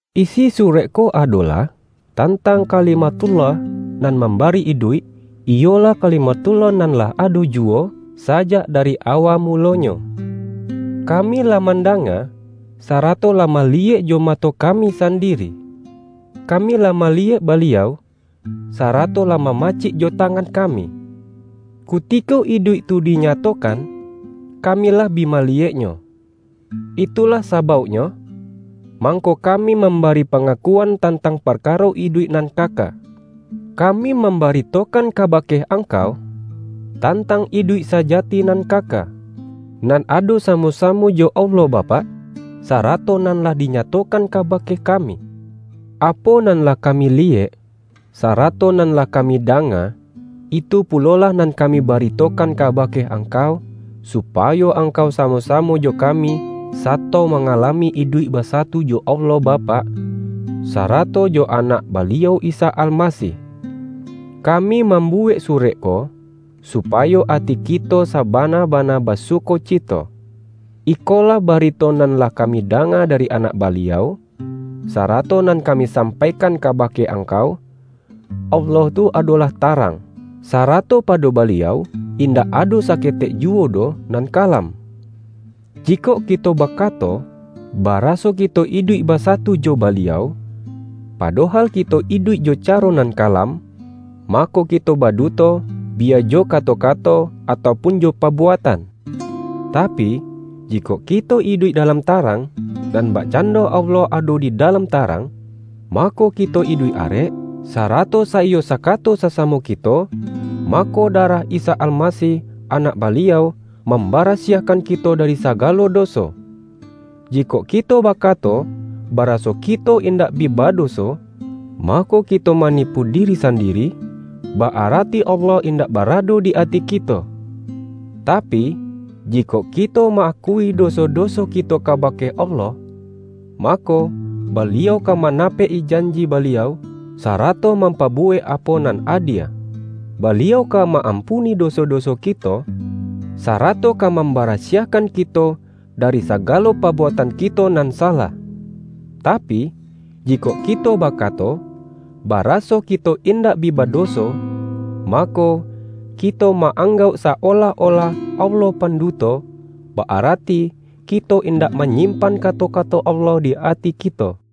Isi surek ko adolah tantang Ka-limathullah nan mambari iduik, iyolah Kalimathullah nan lah ado ju-wo, sajak dari awa mulonyo. Kami lah mandanga, sarato lah maliyek jo mato kami sandiri. Kami lah ma-liyek Baliau, sarato lah mamacik jo tangan kami. Kutiko iduik tu dinya-tokan, kami lah bi maliyeknyo. Itu-lah sabauknyo, mangko kami mam-bari pangakuan tantang parkaro iduik nan kaka. Kami mambaritokan kaba-ke angkau, tantang iduik sajati nan kaka, nan ado samo-samo jo Allah Bapak, sarato nan lah dinyatokan ka-bake kami. Apo nan lah kami liyek, sarato nan lah kami danga, itu pulo-lah nan kami baritokan kabake ang-kau, supayo angkau samo-samo jo ka-mi, sato mangalami iduik basatu jo Allah Bapak, sarato jo Anak Baliau Isa Almasih. Kami mambuwek surek ko, supayo ati kito sabana-bana basuko-cito. Ikolah barito nan lah kami danga dari Anak Baliau, sarato nan kami sampaikan kabake angkau: Allah tu adolah tarang, sarato pado Baliau in-dak ado saketek juwo doh nan kalam. Jikok kito bakato, baraso kito iduik basatu jo Baliau, padohal kito iduik jo caro nan kalam, mako kito baduto, bi-ya jo kato-kato atau pun jo pabuatan. Tapi, jikok kito iduik dalam tarang, nan bakcando Allah ado di dalam ta-rang, mako kito iduik arek, sarato saiyo sakato sasamo kito, mako, darah Isa Almasih, Anak Baliau, mambara-siahkan kito dari sagalo doso. Jikok kito bakato, baraso kito in-dak bi badoso, mako kito manipu diri sandiri; ba-arati Allah indak barado di ati kito. Tapi, jikok kito ma-akui do-so-doso kito kabake Allah, mako, Ba-liau ka manapek-i janji Baliau, sara-to mampabuwek apo nan adie. Baliau ka ma-ampuni doso-doso kito, sarato ka mambarasiahkan kito dari sagalo pabuatan kito nan salah. Tapi, ji-kok kito bakato, baraso kito indak bi badoso, mako, kito ma-anggauk sa-olah-olah Allah panduto, ba-arati ki-to indak manyimpan kato-kato Allah di ati kito.